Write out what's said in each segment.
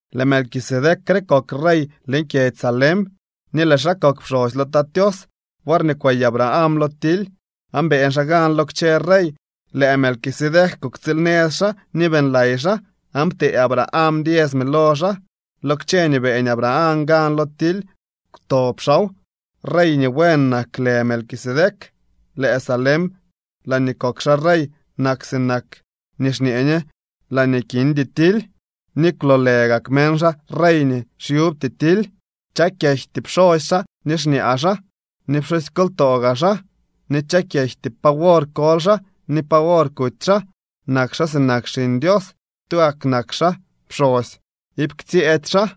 Lëë Melquisedec re kok rey leñ kyedzy Salem ni lëë xaa kok pxosy lo Tat Tios. Worñee kwey Abraham lo tily aan beeñ xaa gan lo kchë rey, lëë Melquisedec kuktsiilnëz xaa ni beeñlay xaa, aan ptee Abraham diesme lo xaa. Lo kchë nii beeñ Abraham gan lo tily kwtob xaaw. (Rey nii buen nak lë Melquisedec. Lëë Salem laañee kok xaa rey nak sinak nii xñee ñe laañee kindy tily ni kwloolë gak meñ xaa rey nii xyubty tily.) Chak yejty pxosy xaa ni xñaa xaa ni pxusykoltoo gaa xaa, ni chak yejty pa wor koly xaa ni pa wor kuty xaa. Nak xaa sinak Xiñ Dios. Tugak nak xaa pxosy, iip ktsyëëdy xaa.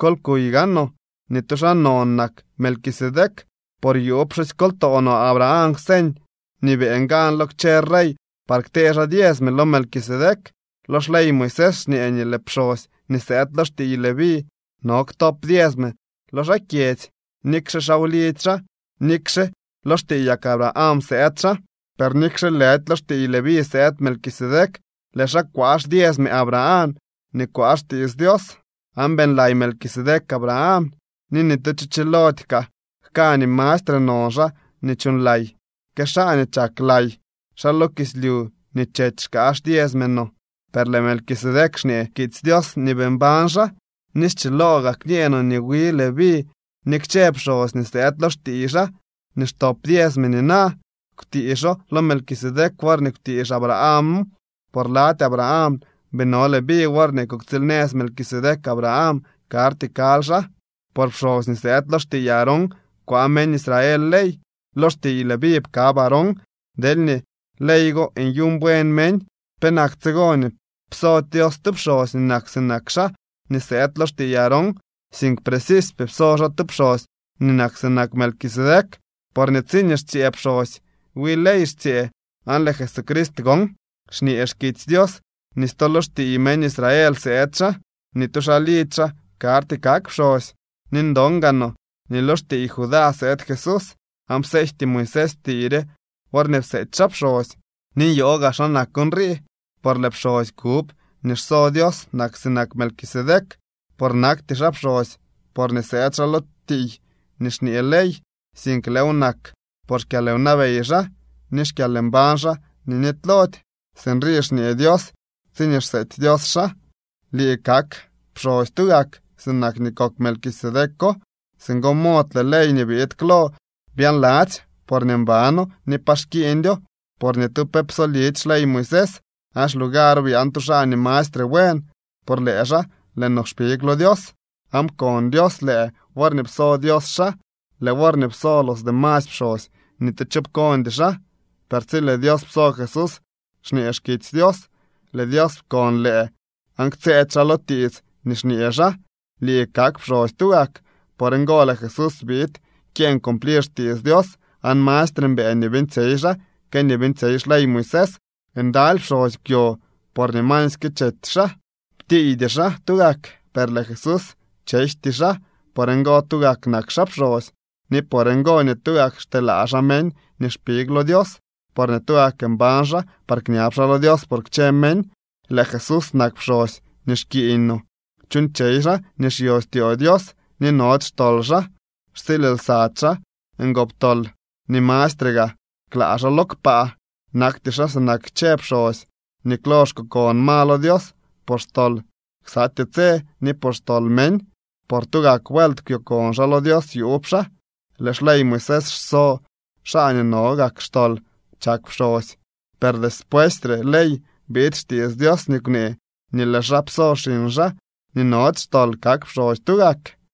Kol kuy gaanoo nii tu xaa non nak Melquisedec, por yuub pxusykoltoo no Abraham kwseñ nii beeñ gan lo kchë rey par ktee xaa diesme lo Melquisedec. Lo xley Moisés xñee nii lëë pxosy nii sëëd lo xtiiy Leví no ktop diesme lo xaa kyedzy, nikxe xaa wlidzy xaa ni nikxe lo xtiiyak Abraham sëëd xaa. Per nikxe lëdy lo xtiiy Leví sëëd Melquisedec, lëë xaa kwaa xdiesme Abraham nii kwaa xtiits Dios. Aan beeñlay Melquisedec Abraham. Ni ni tu cho chiloody kaa jka nii mastre non xaa nii chuuñlay, que xaa nii chak lay. Xaa lo kislyu nii chety xkaa xdiesme no, per lëë Melquisedec, xñee xkitsy Dios nii bii mbañ xaa. Ni schiloo gaa kñee no nii wi Leví ni kchë pxosy nii sëëd lo xtiiy xaa nii xtop diesme nina kwtiixo lo Melquisedec worñee kwtiix Abrahamo. Por lady Abraham bii no Leví worñee kuktsiilnëz Melquisedec Abraham. Karty kaly xaa. Por pxosy nii sëëd lo xtiiy Aarón kwaa meñ Israel ley. (Lo xtiiy Leví pkab Aarón.) Deelñee ley go nyuuñ buen meñ, penak tsigo nii psody Dios tu pxosy nii nak sinak xaa nii sëëd lo xtiiy Aarón, sink precisypee pso xaa tu pxosy nii nak sinak Melquisedec. Porñee tsiñee xtsyëë pxosy, wi ley xtsyëë, aan lëë Jesucrist gon, xñee xkitsy Dios nii stu lo xtiiy meñ Israel sëëd xaa. Ni tu xaa lidzy xaa karty kak pxosy. Ni ndon gaa no nii lo xtiiy Judá sëëd Jesús, aan pseejty Moisés tiiy re worñee pseety xaa pxosy. Ni nyoo gaa xa nak nrii, por lëë pxosy kub nii xso Dios nak sinak Melquisedec, por nakty xaa pxosy porñee sëëd xaa lo tiiy nii xñee ley, sink lëëw nak por xkyalwnabey xaa ni xkyalmbañ xaa nii nitylody. Sinrii xñee Dios tsiñee xseety Dios xaa: Lii kak pxosy tugak, sinak nii kok Melquisedeco. Singo mod lëë ley nii biid klo byaanladzy porñee mbano ni pa xkiiñdyo, por ni tu pe psolidy xley Moisés. Aan xlugaro byaan tu xaa nii mastre buen. Por lëë xaa, lëë no kpig lo Dios. Aan pkon Dios lëë worñee pso Dios xaa. Lëë worñee pso los demasy pxosy, ni tu cho pkondy xaa, per tsi lëë Dios pso Jesús, xñee xkitsy Dios: Lëë Dios pkon lëë aan ktsëëdy xaa lo tiits nii xñee xaa: “Lii kak pxosy tugak.” Por ngo lëë Jesús biid kyeeñ cumplir xtiits Dios aan mastre mbëë nii beeñtsyey xaa que nii beeñtsyey xley Moisés. Ndaly pxosy kwyo porñee masyke chety xaa, ptiiydy xaa tugak. Per lëë Jesús, chejty xaa. Por ngo, tugak nak xaa pxosy. Ni por ngo nii tugak xteelaa xaa meñ nii xpig lo Dios, porñee tugak mbañ xaa par kñab xaa lo Dios por kchë meñ. Lëë Jesús nak pxosy nii xkiiñ no. Chuuñtsyey xaa nii xyo styoo Dios, ni nody xtol xaa. Xtsiil lsady xaa ngoptol, ni mastre gaa klaa xaa lo kpaa. Nakty xaa sinak kchë pxosy nii klo xkokon ma lo Dios por xtol ksatyee tse, ni por xtol meñ. Por tugak vuelt kwyokon xaa lo Dios yuub xaa. Lëë xley Moisés xso xaa nii no gak xtol chak pxosy. Per despuesy re ley biid xtiits Dios nii kwnee nii lëë xaa pso xiñ xaa nii nody xtol kak pxosy tugak.